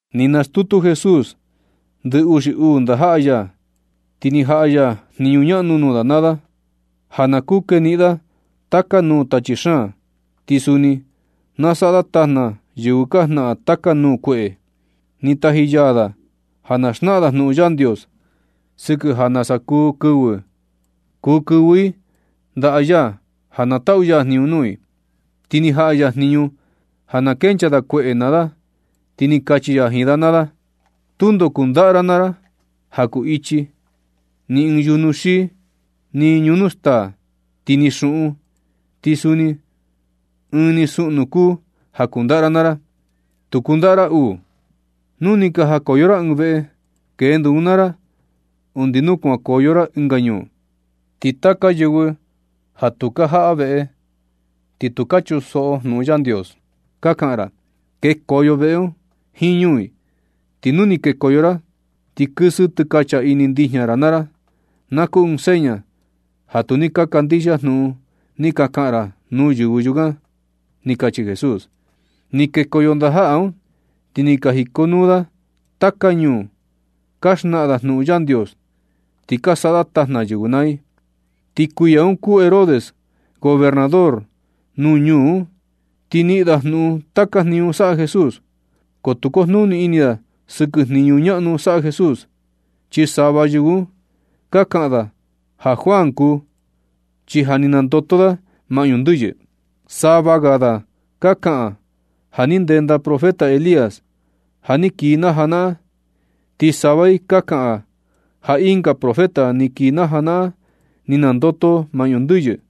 Ni nastutu Jesús ndɨ uxi uu ndajaꞌa ya, ti ni jaꞌa ya jniñu ñaꞌnu nuu da naa da ja na kuu keniꞌin da taka nuu tachi xaan, ti suni na saꞌa da tajna yɨvɨ ka jnaꞌan taka nuu kueꞌe. Ni taji ya da ja na xnaꞌan da jnuꞌun Yandios sɨkɨ ja nasa kuu kɨvɨ i ndaꞌa ya ja na taꞌu ya jniñu nuu i. Ti ni jaꞌa ya jniñu ja na kenchaa da kueꞌe naa da. Ti ni kachi ya jiin da naa da: ―Tundo kundaꞌa ra naa ra ja kuu ichi, ni ɨɨn yujnu xii, ni ñunu staa, ti ni xuꞌun. Ti suni ɨɨn ni suꞌnu kuu ja kundaꞌa ra naa ra, tu kundaꞌa ra uu. Nu ni ka jakoyo ra ɨɨn veꞌe, kendo un naa ra undi nu kuankoyo ra ɨnga ñuu. Ti taka yɨvɨ ja tu ka jaꞌa veꞌe, ni tu ka chunsoꞌo jnuꞌun Yandios ka kaꞌan ra, kekoyo veꞌe un jiin ñuu i. Ti nu ni kekoyo ra, ti kɨsɨ tɨkacha ini ndijña ra naa ra, na kuu ɨɨn seña ja tu ni ka kandixia jnuꞌun ni ka kaꞌan ra nuu yɨvɨ yukan ―ni kachi Jesús. Ni kekoyo ndajaꞌa un, ti ni ka jikonuu da taka ñuu ka xnaꞌan da jnuꞌun Yandios, ti ka saꞌa da tajna yɨvɨ naa i. Ti kuiya un kuu Herodes gobernador nuu ñuu un, ti ni niꞌin da jnuꞌun taka jniñu saꞌa Jesús, ko tu kojnuni ini da sɨkɨ jniñu ñaꞌnu saꞌa Jesús, chi sava yɨvɨ un ka kaꞌan ja Juan kuu, chi ja ni nandoto da maꞌñu ndɨyɨ. Sava ga ka kaꞌan ja ni ndenda profeta Elías ja ni kii na janaꞌan, ti sava i ka kaꞌan ja ɨnga profeta ni kii na janaꞌan ni nandoto maꞌñu ndɨyɨ.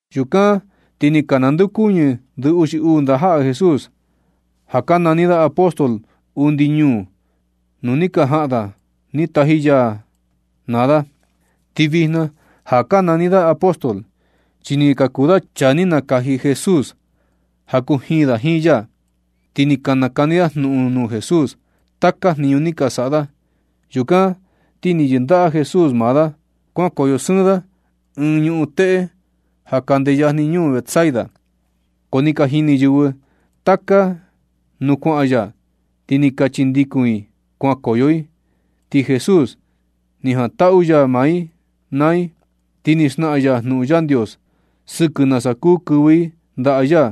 Yukan ti ni ka nandeokuñɨ ndɨ uxi uu ndajaꞌa Jesús, ja ka nani apóstol, undi ñuu nuu ja ni ka jaꞌan da ni taji ya da naa da. Ti vijna ja ka nani da apóstol, chi ni ka kuu da chaa ni nakaji Jesús ja kujiin da jiin ya. Ti ni ka nakani da jnuꞌun nuu Jesús taka jniñu ni ka saꞌa da. Yukan ti ni yɨndaꞌa Jesús maa da kuankoyo sɨɨn da ɨɨn ñuꞌun teꞌe ja kande yajni ñuu Betsaida. Ko ni ka jini yɨvɨ taka nuu kuaꞌan ya, ti ni ka chindikun i kuankoyo i. Ti Jesús ni jantaꞌu ya maa i naa i. Ti ni xnaꞌan ya jnuꞌun Yandios sɨkɨ nasa kuu kɨvɨ i ndaꞌa ya,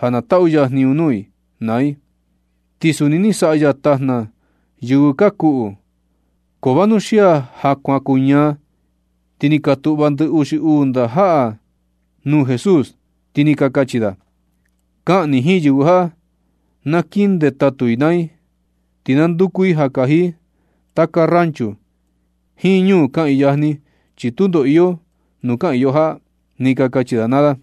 ja na taꞌu ya jniñu nuu i naa i. Ti suni ni saꞌa ya tajna yɨvɨ ka kuꞌu. Ko vanuxia ja kuan kuñaa, ti ni ka tuꞌva ndɨ uxi uu ndajaꞌa un nuu Jesús, ti ni ka kachi da: ―Kaꞌan ni jiin yɨvɨ ja na kiꞌin ndetatu i naa i, ti na nduku i ja kaji i taka rancho jiin ñuu kaꞌiin yajni, chi tundo iyo nuu kaꞌiin yo jaꞌa ―ni ka kachi da naa da.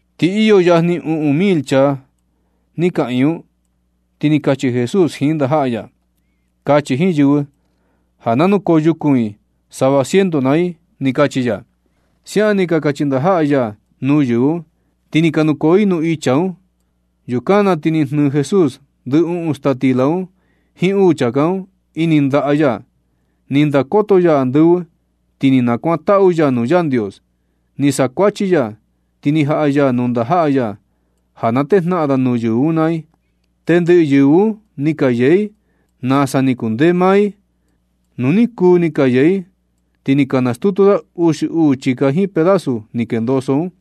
Ti iyo yajni uꞌun mil chaa ni kaꞌiin un. Ti ni kachi Jesús jiin ndajaꞌa ya: ―Kachi jiin yɨvɨ ja na nukoo yukun i sava ciento naa i ―ni kachi ya. Siaꞌan ni kachi ndajaꞌa ya nuu yɨvɨ un, ti ni ka nukoo i nuu icha un. Yukan na ti ni jnɨɨ Jesús ndɨ uꞌun staa stila un jiin uu chāká un ini ndaꞌa ya. Ni ndakoto ya andɨvɨ, ti ni nakuantaꞌu ya nuu Yandios. Ni sakuachi ya, ti ni jaꞌa ya nuu ndajaꞌa ya ja na tejnaꞌan da nuu yɨvɨ un naa i. Tendɨꞌɨ yɨvɨ un ni ka yee i nasa ni kundee maa i. Nu ni kuu ni ka yee i, ti ni ka nastutu da uxi uu chika jiin pedazu ni kendoso un.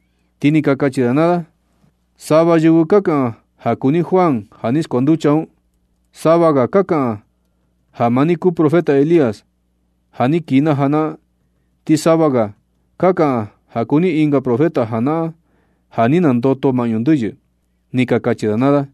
Ti ni ka kachi da naa da: ―Sava yɨvɨ ka kaꞌan ja kuu ni Juan ja ni skuanducha un. Sava ga ka kaꞌan ja maa ni kuu profeta Elías, ja ni kii na janaꞌan. Ti sava ga ka kaꞌan ja kuu ni ɨnga profeta janaꞌan, ja ni nandoto maꞌñu ndɨyɨ ―ni ka kachi da naa da.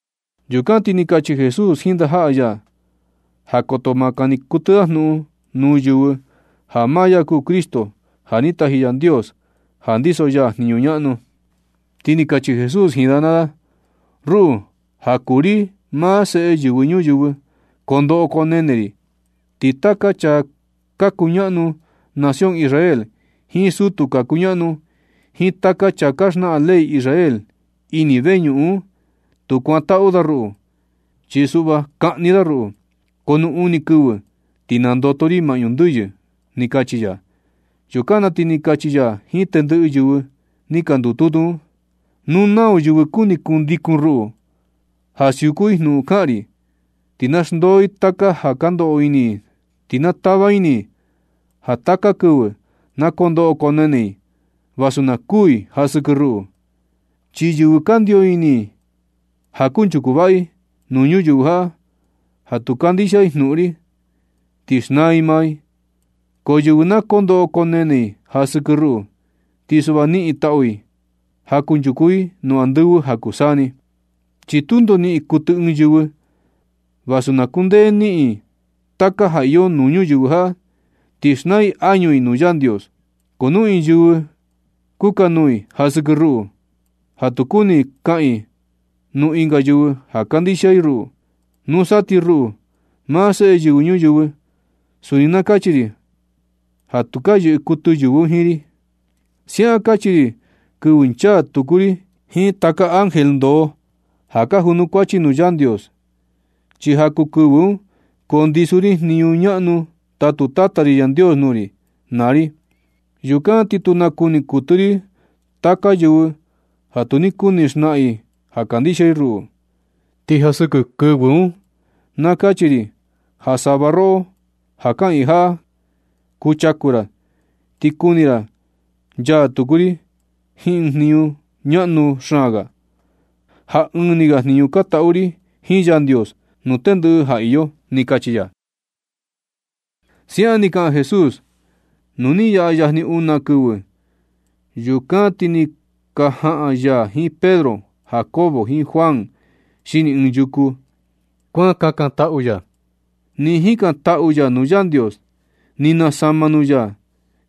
Yukan na ti ni kachi Jesús jiin ndajaꞌa ya ja koto ma kani kuɨtɨ da jnuꞌun nuu yɨvɨ ja maa ya kuu Cristo, ja ni taji Yandios ja ndiso ya jniñu ñaꞌnu. Ti ni kachi Jesús jiin da naa da: ―Ruꞌu, ja kuu ri maa Seꞌe Yɨvɨ Ñuyɨvɨ, kondoꞌo koo nene ri. Ti taka chaa ka kuñaꞌnu nación Israel, jiin sutu ka kuñaꞌnu, jiin taka chaa ka xnaꞌan ley Israel ini veñuꞌun un, tu kuantaꞌu da ruꞌu. Chi suꞌva kaꞌni da ruꞌu. Ko nu uni kɨvɨ ti nandoto ri maꞌñu ndɨyɨ ―ni kachi ya. Yukan na ti ni kachi ya jiin tendɨꞌɨ yɨvɨ ni ka ndututu un: ―Nu nau yɨvɨ kuni kundikun ruꞌu, ja siuku i jnuꞌun kaꞌan ri, ti na xndoo i taka ja ka ndoꞌo ini i un, ti na tava ini i ja taka kɨvɨ na kondoꞌo koo nene i vasu na kuu i ja sɨkɨ ruꞌu. Chi yɨvɨ kandio ini ja kunchuku vaꞌa i nuu ñuyɨvɨ jaꞌa ja tu kandixia i jnuꞌun ri, ti xnaa i maa i. Ko yɨvɨ na koo ndoꞌo koo nene i ja sɨkɨ ruꞌu, ti suꞌva niꞌin taꞌu i ja kunchuku i nuu andɨvɨ ja kuu saa ni. Chi tundo niꞌin kuɨtɨ ɨɨn yɨvɨ, vasu na kundee i niꞌin i taka ja iyo nuu ñuyɨvɨ jaꞌa, ti xnaa i añu i nuu Yandios. Ko nu ɨɨn yɨvɨ kukanuu i ja sɨkɨ ruꞌu, ja tu kuni kaꞌan i nuu ɨnga yɨvɨ ja kandixia i ruꞌu, nusa ti ruꞌu, maa Seꞌe Yɨvɨ Ñuyɨvɨ, suni na kachi ri ja tu ka yɨꞌɨ kuɨtɨ yɨvɨ un jiin ri. Siaꞌan kachi ri kɨvɨ nchaa ri tuku jiin taka ángel ndoo ja ka junukuachi nuu Yandios. Chi ja kuu kɨvɨ un kundiso ri jniñu ñaꞌnu tatu Tata ri Yandios nuu ri naa ri. Yukan ti tu nakuni kuɨtɨ ri taka yɨvɨ ja tu ni kuni xnaꞌan i ja kandixia i ruꞌu. Ti ja sɨkɨ kɨvɨ un, na kachi ri ja sava roꞌo ja kaꞌiin jaꞌa kuchaku ra, ti kuni ra nchaa tuku ri jiin ɨɨn jniñu ñaꞌnu xaan ga, ja ɨɨn ni ga jniñu ka taꞌu ri jiin Yandios nuu tendɨꞌɨ ja iyo ―ni kachi ya. Siaꞌan ni kaꞌan Jesús, nu ni yaꞌa yajni una kɨvɨ. Yukan ti ni ka jaꞌan ya jiin Pedro, Jacobo jiin Juan xini ɨɨn yuku, kuan kakantaꞌu ya. Nɨ jikantaꞌu ya nuu Yandios, ni nasama nuu ya,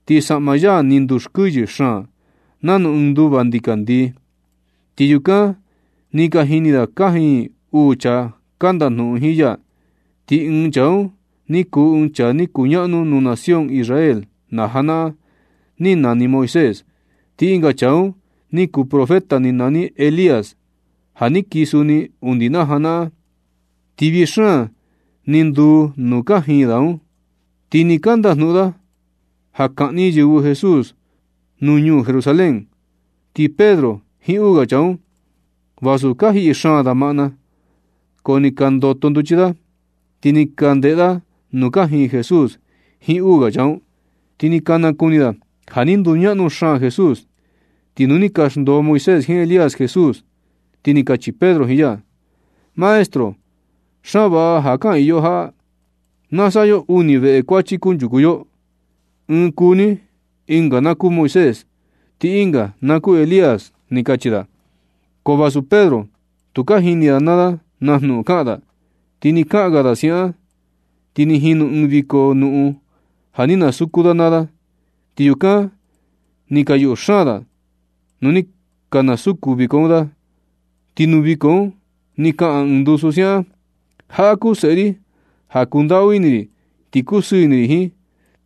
ti saꞌma ya ni nduskuɨyɨ xaan nanu ɨɨn nduva ndikandii. Ti yukan ni ka jini da kajiin uu chaa ka ndajnuꞌun jiin ya. Ti ɨɨn chaa un ni kuu ɨɨn chaa ni kuñaꞌnu nuu nación Israel na janaꞌan ni nani Moisés, ti ɨnga chaa un ni kuu profeta ni nani Elías ja ni kii suni undi na janaꞌan. Ti vii xaan ni nduu nuu kajiin da, ti nɨ ka ndajnuꞌun da ja kaꞌni yɨvɨ Jesús nuu ñuu Jerusalén. Ti Pedro jiin uu ga chaa un, vasu ka jiꞌi xaan da maꞌna, ko ni ka ndoto nduchi da, ti ni ka ndeꞌe da nuu kajiin Jesús jiin uu ga chaa un, ti ni ka nakuni da ja ni nduñaꞌnu xaan Jesús. Ti nu ni ka xndoo Moisés jiin Elías Jesús, ti ni kachi Pedro jiin ya: ―Maestro, xaan vaꞌa ja kaꞌiin yo jaꞌa. Na saꞌa yo uni veꞌe kuachi kunchuku yo, ɨɨn kuu ni, ɨnga na kuu Moisés, ti ɨnga na kuu Elías ―ni kachi da. Ko vasu Pedro, tukaa jini da naa jnuꞌun kaꞌan da. Ti nɨ kaꞌan ga da siaꞌan, ti ni jinu ɨɨn viko nuꞌun ja ni nasuku da naa da, ti yukan ni ka yuꞌu xaan da nu ni kasuku viko un da. Ti nuu viko un ni kaꞌan ɨɨn ndusu siaꞌan: ―Jaꞌa kuu seꞌe ri ja kundaꞌu ini ri ti kusɨɨ ini ri jiin.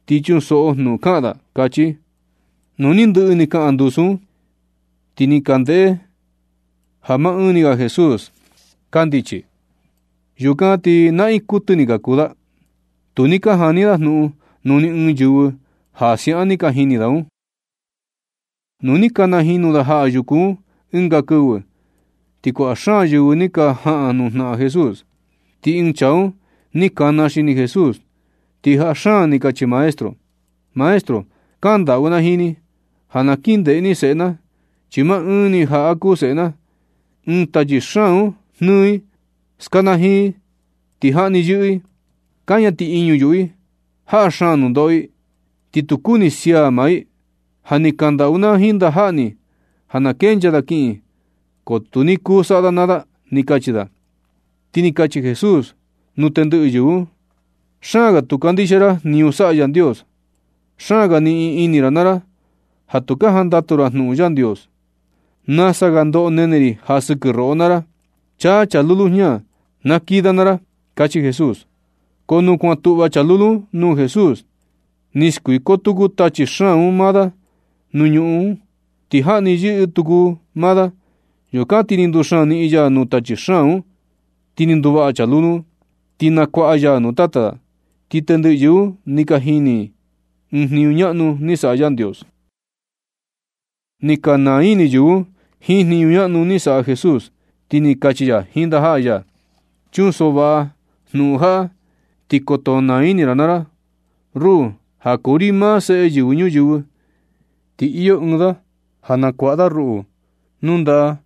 Ti chunsoꞌo jnuꞌun kaꞌan da ―kachi. Nu ni ndɨꞌɨ ni kaꞌan ndusu un, ti ni ka ndeꞌe da ja maa ɨɨn ni ga Jesús kandichi. Yukan ti naꞌiin kuɨtɨ ni ka kuu da. Tu ni ka jani da jnuꞌun nuu ni ɨɨn yɨvɨ ja siaꞌan ni ka jini da un. Nu ni ka najinu da jaꞌa yuku un ɨnga kɨvɨ, ti kuaꞌa xaan yɨvɨ ni ka jaꞌan nujnaꞌan Jesús. Ti ɨɨn chaa un ni kana xini Jesús, ti jaa xaan ni kachi da: ―Maestro, kandaꞌu na jiin ni ja na kin ndeꞌe ni seꞌe na, chi maa ɨɨn ni jaꞌa kuu seꞌe na. Ɨɨn tachi xaan un jnɨɨ i, skanajiin i ti jaꞌni yɨꞌɨ i, kaña tiꞌiñu yuꞌu i. Jaꞌa xaan nundoꞌo i, ti tu kuni sia maa i. Ja ni kandaꞌu na jiin ndajaꞌa ni ja na kenchaa da kiꞌin, ko tu ni kuu saꞌa da naa da ―ni kachi da. Ti ni kachi Jesús nuu tendɨꞌɨ yɨvɨ un: ―Xaan ga tu ka kandixia ra jniñu saꞌa Yandios. Xaan ga niꞌin ini ra naa ra ja tu ka jandatu ra nuu Yandios. Nasa ga ndoꞌo nene ri ja sɨkɨ roꞌo naa ra. Chaan chaa lulu jña, na kii da naa ra ―kachi Jesús. Ko nu kuan tuꞌva chaa lulu un nuu Jesús, ni skuiko tuku tachi xaan un maa da nuu ñuꞌun un, ti jaꞌni yɨꞌɨ tuku maa da. Yukan ti ni nduxaan niꞌin ya nuu tachi xaan un, ti ni nduvaꞌa chaa lulu un. Ti ni nakuaꞌa ya nuu tata da. Ti tendɨꞌɨ yɨvɨ un ni ka naa ini i jiin jniñu ñaꞌnu saꞌa Yandios. Nɨ ka naa ini yɨvɨ un jiin jniñu ñaꞌnu ni saꞌa Jesús, ti ni kachi ya jiin ndajaꞌa ya: ―Chunsoꞌo vaꞌa jnuꞌun jaꞌa, ti koto naa ini ra naa ra. Ruꞌu, ja kuu ri maa Seꞌe Yɨvɨ Ñuyɨvɨ, ti iyo ɨɨn da ja nakuaꞌa da ruꞌu nuu ndaꞌa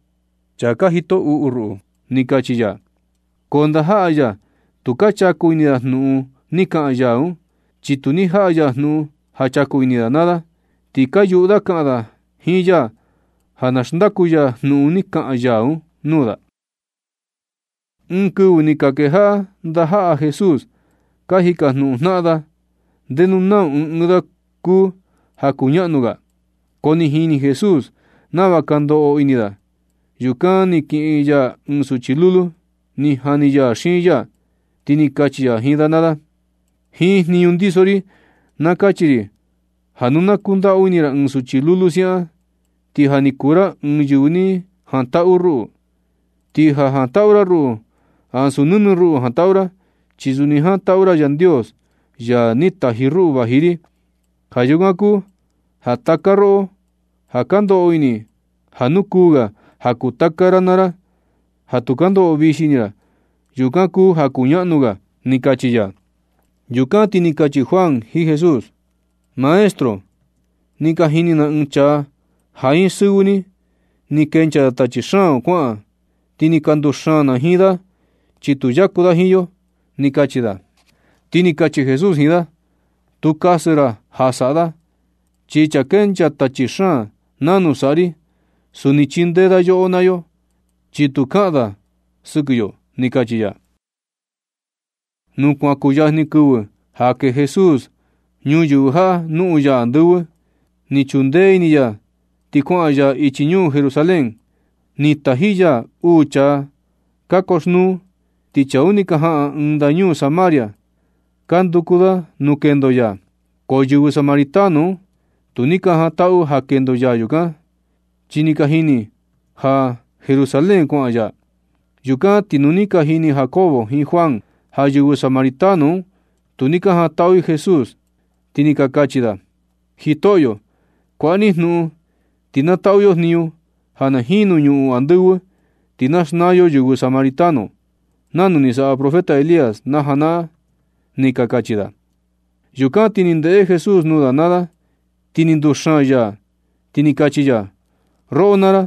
chaa ka jito uꞌu ruꞌu ―ni kachi ya. Ko ndajaꞌa ya tu ka chaku ini da jnuꞌun ni kaꞌan ya un, chi tu ni jaꞌa ya jnuꞌun ja chaku ini da naa da. Ti ka yuꞌu da kaꞌan da jiin ya ja na xndaku ya jnuꞌun ni kaꞌan ya un nuu da. Ɨɨn kɨvɨ ti ni ka kejaꞌa ndajaꞌa Jesús ka jikajnuꞌun jnaꞌan da na ndenu nau ɨɨn ɨɨn da kuu ja kuñaꞌnu ga. Ko ni jini Jesús nava ka ndoꞌo ini da. Yukan ni kiꞌin ya ɨɨn suchi lulu, ni jani ya xiin ya, ti ni kachi ya jiin da naa da: ―Jiin jniñu ndiso ri na kachi ri ja nu na kundaꞌu ini ra ɨɨn suchi lulu siaꞌan, ti ja ni kuu ra ɨɨn yɨvɨ ni jantaꞌu ruꞌu. Ti ja jantaꞌu ra ruꞌu, ansu nɨnɨ ruꞌu jantaꞌu ra, chi suni jantaꞌu ra Yandios, ya ni taji ruꞌu vaji ri. Ja yukan kuu ja taka roꞌo ja ka ndoꞌo ini ja nukuu ga ja kuu taka ra naa ra, ja tu ka ndoꞌo vixi ini ra, yukan kuu ja kuñaꞌnu ga ―ni kachi ya. Yukan ti ni kachi Juan jiin Jesús: ―Maestro, ni ka jini na ɨɨn chaa ja jiin sɨvɨ ni ni kenchaa da tachi xaan un kuaꞌan, ti ni ka nduxaan na jiin da, chi tu yaku da jiin yo ―ni kachi da. Ti ni kachi Jesús jiin da: ―Tu kasɨ ra ja saꞌa da, chi chaa kenchaa tachi xaan nanu saꞌa ri, suni chindee da yoꞌo naa yo, chi tu kaꞌan da sɨkɨ yo ―ni kachi ya. Nu kuan kuyajni kɨvɨ ja kee Jesús ñuyɨvɨ jaꞌa noꞌon ya andɨvɨ, ni chundee ini ya ti kuaꞌan ya ichi ñuu Jerusalén. Ni taji ya uu chaa ka yoxnuu, ti chaa un ni ka jaꞌan ɨɨn ndañuu Samaria ka nduku da nuu kendo ya, ko yɨvɨ Samaritano un tu ni ka jantaꞌu ja kendo ya yukan, chi ni ka jini ja Jerusalén kuaꞌan ya. Yukan ti nu ni ka jini Jacobo jiin Juan ja yɨvɨ Samaritano un, tu ni ka jantaꞌu i Jesús, ti ni ka kachi da: ―Jitoꞌyo, kuaꞌa ni jnuꞌun ti na taꞌu yo jniñu ja na jinu ñuꞌun andɨvɨ, ti na xnaa yo yɨvɨ Samaritano un, nanu ni saꞌa profeta Elías na janaꞌan―ni ka kachi da. Yukan ti ni ndeꞌe Jesús nuu da naa da, ni nduxaan ya, ti ni kachi ya: ―Roꞌo naa ra,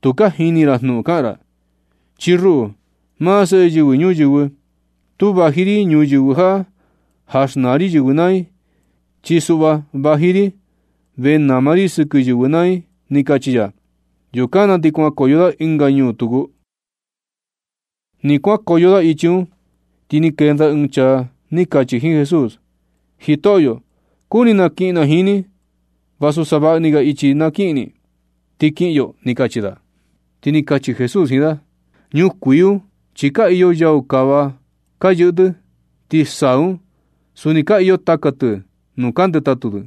tu ka jini ra na jnuꞌun ka kaꞌan ra. Chi ruꞌu, maa Seꞌe Yɨvɨ Ñuyɨvɨ, tu vaji ri ñuyɨvɨ jaꞌa ja xnaa ri yɨvɨ naa i, chi suꞌva, vaji ri vee nama ri sɨkɨ yɨvɨ naa i ―ni kachi ya. Yukan na ti kuankoyo da ɨnga ñuu tuku. Nɨ kuankoyo da ichi un, ti ni kenda ɨɨn chaa ni kachi jiin Jesús: ―Jitoꞌyo, kuni kiꞌin na jiin ni vasu savaꞌa ni ga ichi na kiꞌin ni, ti kiꞌin yo ―ni kachi da. Ti ni kachi Jesús jiin da: ―Ñukuii un chi ka iyo yau kava ka yɨꞌɨ tɨ. Ti saa un suni ka iyo taka tɨ nuu ka ndetatu tɨ.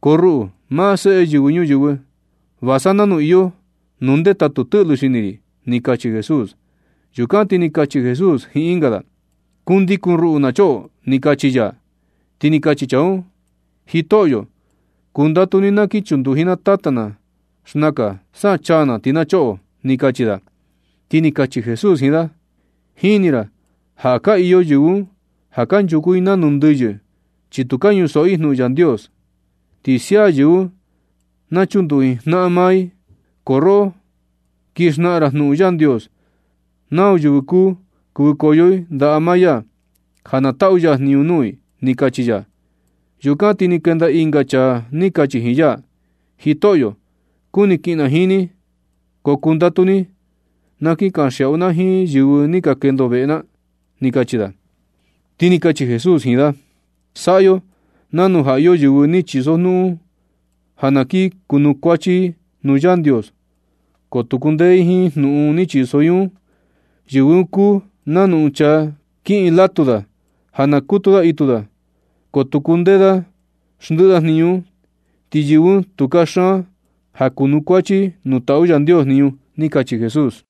Ko ruꞌu, maa Seꞌe Yɨvɨ Ñuyɨvɨ, va sa nanu iyo nuu ndetatu tɨꞌlɨ xini ri ―ni kachi Jesús. Yukan ti ni kachi Jesús jiin ɨnga da: ―Kundikun ruꞌu na choꞌo ―ni kachi ya. Ti ni kachi chaa un: ―Jitoꞌyo, kundatu ni na kin chunduji na tata na xnakan, sa chaa na, ti na choꞌo ―ni kachi da. Ti ni kachi Jesús jiin da: ―Jini ra ja ka iyo yɨvɨ un ja kanchuku i nanu ndɨyɨ, chi tu ka chunsoꞌo i jnuꞌun Yandios. Ti sia yɨvɨ un na chunduji jnaꞌan maa i. Ko roꞌo, kin xnaꞌan ra jnuꞌun Yandios nau yɨvɨ kuu kɨvɨkoyo i ndaꞌa maa ya, ja na taꞌu ya jniñu nuu i ―ni kachi ya. Yukan ti ni kenda ɨnga chaa ni kachi jiin ya: ―Jitoꞌyo, kuni kiꞌin na jiin ni, ko kundatu ni na kin kanxiaꞌu na jiin yɨvɨ ni ka kendo veꞌe na ―ni kachi da. Ti ni kachi Jesús jiin da: ―Saꞌa yo nanu ja iyo yɨvɨ ni chisojnuꞌun ja na kin kunukuachi i nuu Yandios, ko tu kundee i jiin jnuꞌun ni chiso i un. Yɨvɨ un kuu nanu ɨɨn chaa kiꞌin latu da ja na kutu da itu da, ko tu kundee da xndɨꞌɨ da jniñu un. Ti yɨvɨ un tu kaxaan ja kunukuachi i nuu taꞌu Yandios jniñu ―ni kachi Jesús.